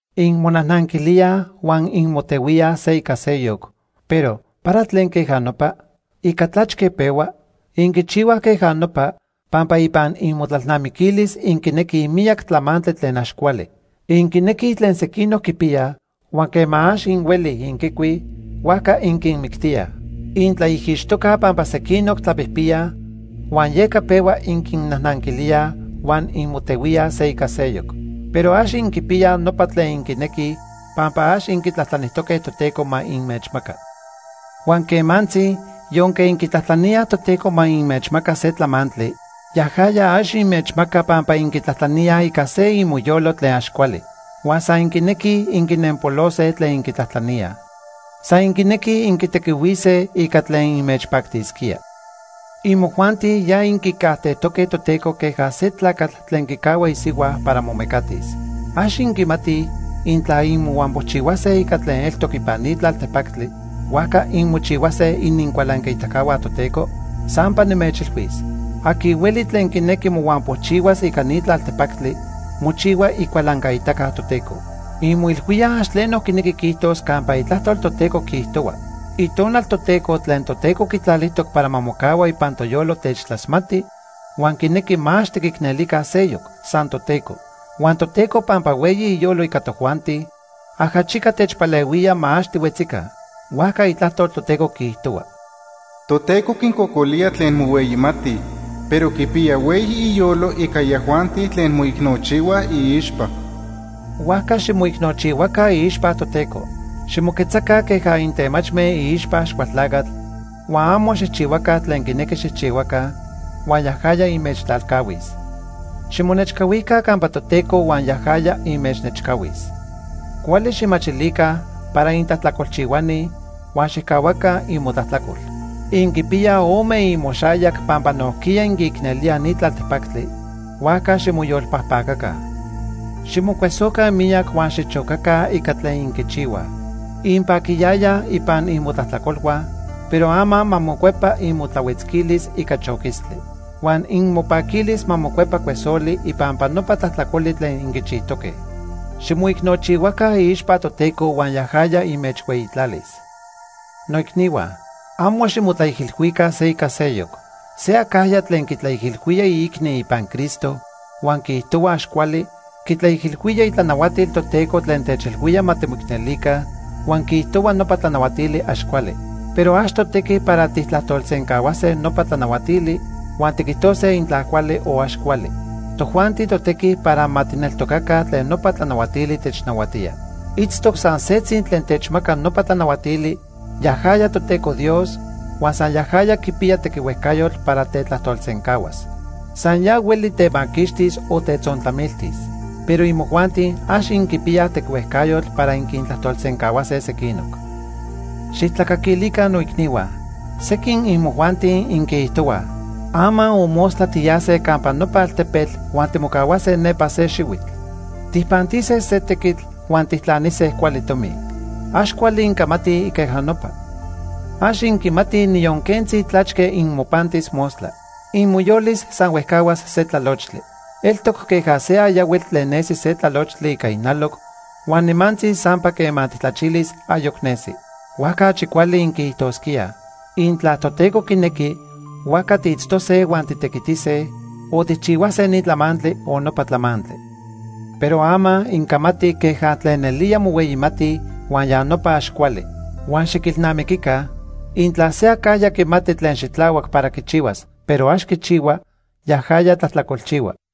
Inmonajnanquilíaj huan inmotehuíaj se ica seyoc, pero ¿para tlen queja nopa? ¿Ica tlachque pehua? Inquichihuaj queja nopa, pampa ipan inmotlalnamiquilis inquinequij miyac tlamantli tlen ax cuali. Inquinequij tlen sequinoc quipiyaj huan quema ax inhuelij inquicuij, huajca inquinmictíaj. Intlaijixtocaj pampa sequinoc tlapijpiyaj huan yeca pehua inquinnajnanquilíaj huan inmotehuíaj se ica seyoc. Pero ax inquipiyaj nopa tlen inquinequij pampa ax inquitlajtlanijtoque Toteco ma inmechmaca. Huan quemantzi, yonque inquitlajtlaníaj Toteco ma inmechmaca se tlamantli, yajaya ax inmechmaca pampa inquitlajtlaníaj ica se imoyolo tlen ax cuali, huan san inquinequij inquinempolose tlen inquitlajtlaníaj. San inquinequij inquitequihuise ica tlen inmechpactisquía. Imojuanti ya inquicajtejtoque Toteco queja se tlacatl tlen quicahua isihua para momecatis. ¿Ax inquimatij, intla inmohuampochihuase ica tlen eltoc ipan ni tlaltepactli, huajca inmochihuase inincualancaitacahua Toteco? Sampa nimechilhuis, aqui hueli tlen quinequi mohuampochihuas ica ni tlaltepactli, mochihua icualancaitaca Toteco. ¿Inmoilhuíaj ax tleno quinequi quiijtos campa Itlajtol Toteco quiijtohua: “Itonal Toteco tlen Toteco quitlalijtoc para ma mocahua ipan toyolo techtlasmati huan quinequi ma ax tiquicnelica seyoc, san Toteco”? Huan Toteco pampa hueyi iyolo ica tojuanti, ajachica techpalehuía ma ax tihuetzica. Huajca Itlajtol Toteco quiijtohua: “Toteco quincocolía tlen mohueyimatij, pero quipiya hueyi iyolo ica yajuanti tlen moicnochihuaj iixpa.” Huajca ximoicnochihua iixpa Toteco. Ximoquetzaca queja intemachme iixpa Axcualtlacatl huan amo xijchihuaca tlen quinequi xijchihuaca, huan yajaya inmechtlalcahuis. Ximonechcahuica campa Toteco huan yajaya inmechnechcahuis. Cuali xijmachilica para intlajtlacolchihuani huan xijcahuaca imotlajtlacol. Inquipiyaj ome imoxayac pampa nojquiya inquiicnelíaj ni tlaltepactli, huajca ximoyolpajpacaca. Ximocuesoca miyac huan xichocaca ica tlen inquichihuaj. Inpaquiyayaj ipan inmotlajtlacolhua, pero ama ma mocuepa imotlahuetzquilis ica choquistli. Huan inmopaquilis ma mocuepa cuesoli ipampa nopa tlajtlacoli tlen inquichijtoque. Ximoicnochihua iixpa Toteco huan yajaya inmechhueyitlalis. Noicnihua, amo ximotlaijilhuica se ica seyoc. Se acajya tlen quitlaijilhuía iicni ipan Cristo huan quiijtohua ax cuali, quitlaijilhuía itlanahuatil Toteco tlen techilhuía ma timoicnelica, huan quiijtohua nopa tlanahuatili ax cuali. Pero ax totequi para tijtlajtolsencahuase nopa tlanahuatili, huan tiquijtose intla cuali o ax cuali. Tojuanti totequi para ma tijneltocaca tlen nopa tlanahuatili technahuatía. Itztoc san setzi tlen techmaca nopa tlanahuatili, yajaya Toteco Dios, huan san yajaya quipiya tequihuejcayotl para tetlajtolsencahuas. San ya hueli temaquixtis o tetzontlamiltis. Pero imojuanti, ax inquipiyaj tequihuejcayotl para inquintlajtolsencahuase sequinoc. Xijtlacaquilica noicnihua. Sequin imojuanti inquiijtohuaj: “Ama o mostla tiyase campa nopa altepetl huan timocahuase nepa se xihuitl. Tijpantise se tequitl huan tijtlanise cuali tomi.” Ax cuali incamatij queja nopa. Ax inquimatij niyon quentzi tlachque inmopantis mostla. Imoyolis san huejcahuas se tlalochtli. Eltoc queja se ayahuitl tlen nesi se tlalochtli ica ijnaloc huan nimantzi sampa quema tijtlachilis, ayoc nesi. Huajca achi cuali inquiijtosquíaj: “Intla Toteco quinequi, huajca tiitztose huan titequitise, o tijchihuase ni tlamantli o nopa tlamantli.” Pero ama, incamatij queja tlen nelía mohueyimatij, huan ya nopa ax cuali. Huan xiquilnamiquica, intla se acajya quimati tlen xitlahuac para quichihuas, pero ax quichihua, yajaya tlajtlacolchihua.